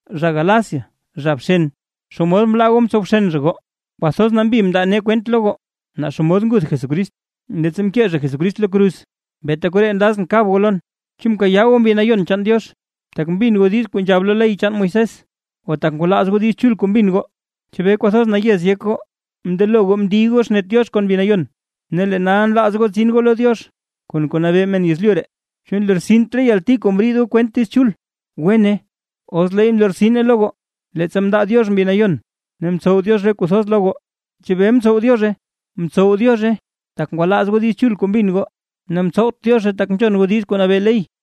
¡Zha Gálacia, zha bxen! ¿Xomod mlaa goo mtsow bxen zha goo? Kwathoz nambi mndaa nee kwent lo goo, naa xomod nguth Jesucrist, leettsa mkee zha Jesucrist lo kruz. Beeta koree nlazʼn kab goo lon: ¿Chu mkayaa goo Mbi Nayon chaan Diox, tak mbin goo diiz kuu nzhab lo ley chaan Moisés, o tak ngwalaaz goo Diiz Chul kuu mbin goo? ¿Chebee kwathoz nayez yek goo? Mndelo goo mndiy goo xnet Diox kon Mbi Nayon, ne lee nal nlaaz goo tsin goo lo Diox kon kuu nabee men yezlyu ree. ¿Chu mlortsint re yalti kuu mriid goo kwent Diiz Chul? ¡Wene, os leey mlortsine lo goo! Leettsa mndaa Diox Mbi Nayon ne mtsow Diox re kuu thoz lo goo, ¿chebee mtsow Diozhe? Mtsow Diozhe, tak ngwalaaz goo Diiz Chul kuu mbin goo, ne mtsowt Diozhe tak nzhon goo diiz kuu nabee ley.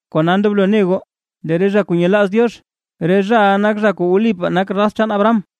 Kona ndoblo ne goo, lee re zha kuu nyelaaz Diox, re zhaʼa nak zha kuu wlipaa nak zha raz chaan Abraham.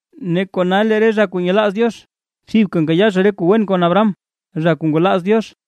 Ne kona lee re zha kuu nyelaaz Diox, thibka nkayaa zha re kuu wen kon Abraham, zha kuu ngwalaaz Diox.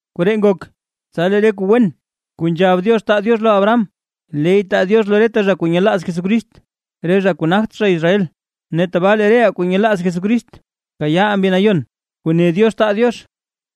Koree ngok, tsa lee re kuu wen kuu nzhab Diox taa Diox lo Abraham, leey taa Diox lo reta zha kuu nyelaaz Jesucrist re zha kuu nagt zha Israel. Ne tabaa lee reʼaa kuu nyelaaz Jesucrist, kayaaʼaa Mbi Nayon kuu ne Diox taa Diox.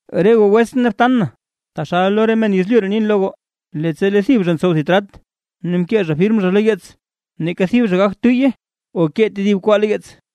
Re goo wetsʼn ne btan na, taxal lo men yezlyu ree nin lo goo: Leettsa lee thib zha ntsow thib trat ne mkee zha firm zha lo yeets, neeka thib zha gagt tuyye o kee tedib kwaa lo yeets.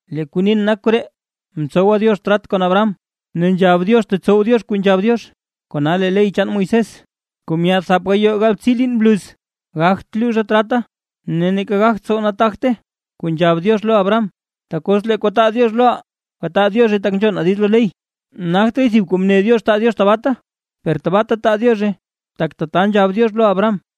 Lee kuu nin nak koree: Mtsowa Diox trat kon Abraham, ne nzhab Diox tetsow Diox kuu nzhab Diox, kona lee ley chaan Moisés, kuu myaad thap gayoo galbtsii liin bluz, gagt luzhe trata, ne neeka gagt tsow nataagte kuu nzhab Diox lo Abraham. Tak os lee kuu taa Diox loʼaa, gataa Diozhe tak nzhonaa diiz lo ley, nagtraay thib kuu mne Diox taa Diox tabaata. Per tabaata taa Diozhe tak tata nzhab Diox lo Abraham.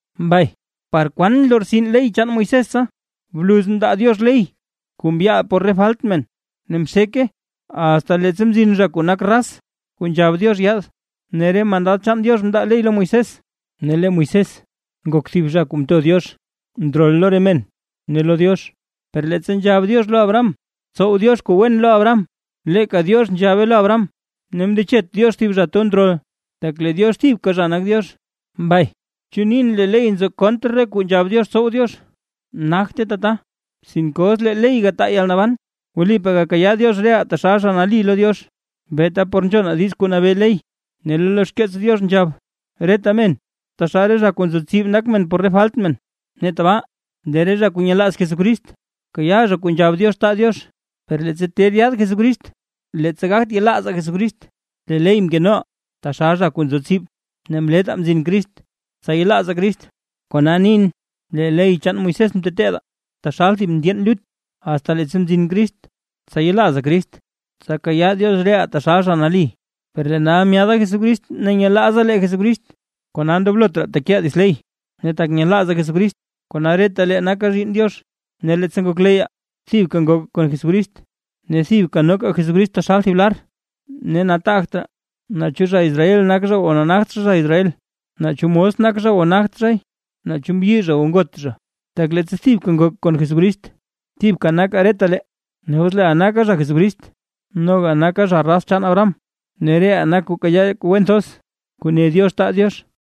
Mbay, ¿par kwan nlortsin ley chaan Moisés tsa? Bluz mndaa Diox ley kuu mbyaal por falt re men. Ne mxeke asta leettsa mzin zha kuu nak “raz” kuu nzhab Diox yaad. Ne re mandad chaan Diox mndaa ley lo Moisés, ne lee Moisés ngok thib zha kuu mto Diox ndrol lo re men ne lo Diox. Per leettsa nzhab Diox lo Abraham tsow Diox kuu wen lo Abraham, leeka Diox nzhabe lo Abraham, ne mndechet Diox thib zha kuu to ndrol, tak lee Diox thibka zha nak Diox. Mbay, ¿chu nin lee ley nzo kontr re kuu nzhab Diox tsow Diox? ¡Nagte tata! Sinke os lee ley gataa yalnaban, wlipaa gakayaa Diox reʼaa taxal zha nali lo Diox, beeta por nzhonaa diiz kuu nabee ley. Ne lee lo xkeets Diox nzhab, reta men taxal re zha kuu nzo tsib nak men por re falt men. Ne tabaa lee re zha kuu nyelaaz Jesucrist, kayaa zha kuu nzhab Diox taa Diox. Per leettsa ter yaad Jesucrist, leettsa gagt yelaazaa Jesucrist, lee ley mkenoʼaa taxal zha kuu nzo tsib, ne mlettaa mzin Crist, tsa yelaazaa Crist. Kona nin, lee ley chaan Moisés mteteedaa taxal thib ndyeen lut, asta leettsa mzin Crist, tsa yelaazaa Crist ne tsa kayaa Diox reʼaa taxal zha nali. Per lee nal myaada Jesucrist ne nyelaazaa lee Jesucrist, kona ndoblot raa tekeʼaa dits ley, ne tak nyelaazaa Jesucrist, kona reta lee nakaa zhiinn Diox. Ne leettsa ngokleyyaa, thibka ngokaa kon Jesucrist, ne thibka noka Jesucrist taxal thib lar. Ne nataagt raa naa chu zha Israel nak zha o nagt zha, zha Israel, naa chu mos nak zha o nagt zhay, naa chu mbyi zha o ngot zha; tak leettsa thibka ngokaa kon Jesucrist, thibka nakaa retalee. Ne os leeʼaa nakaa zha Jesucrist, noga nakaa zha raz chaan Abraham, ne reʼaa nak kuu kayaa re kuu wen thoz kuu ne Diox taa Diox.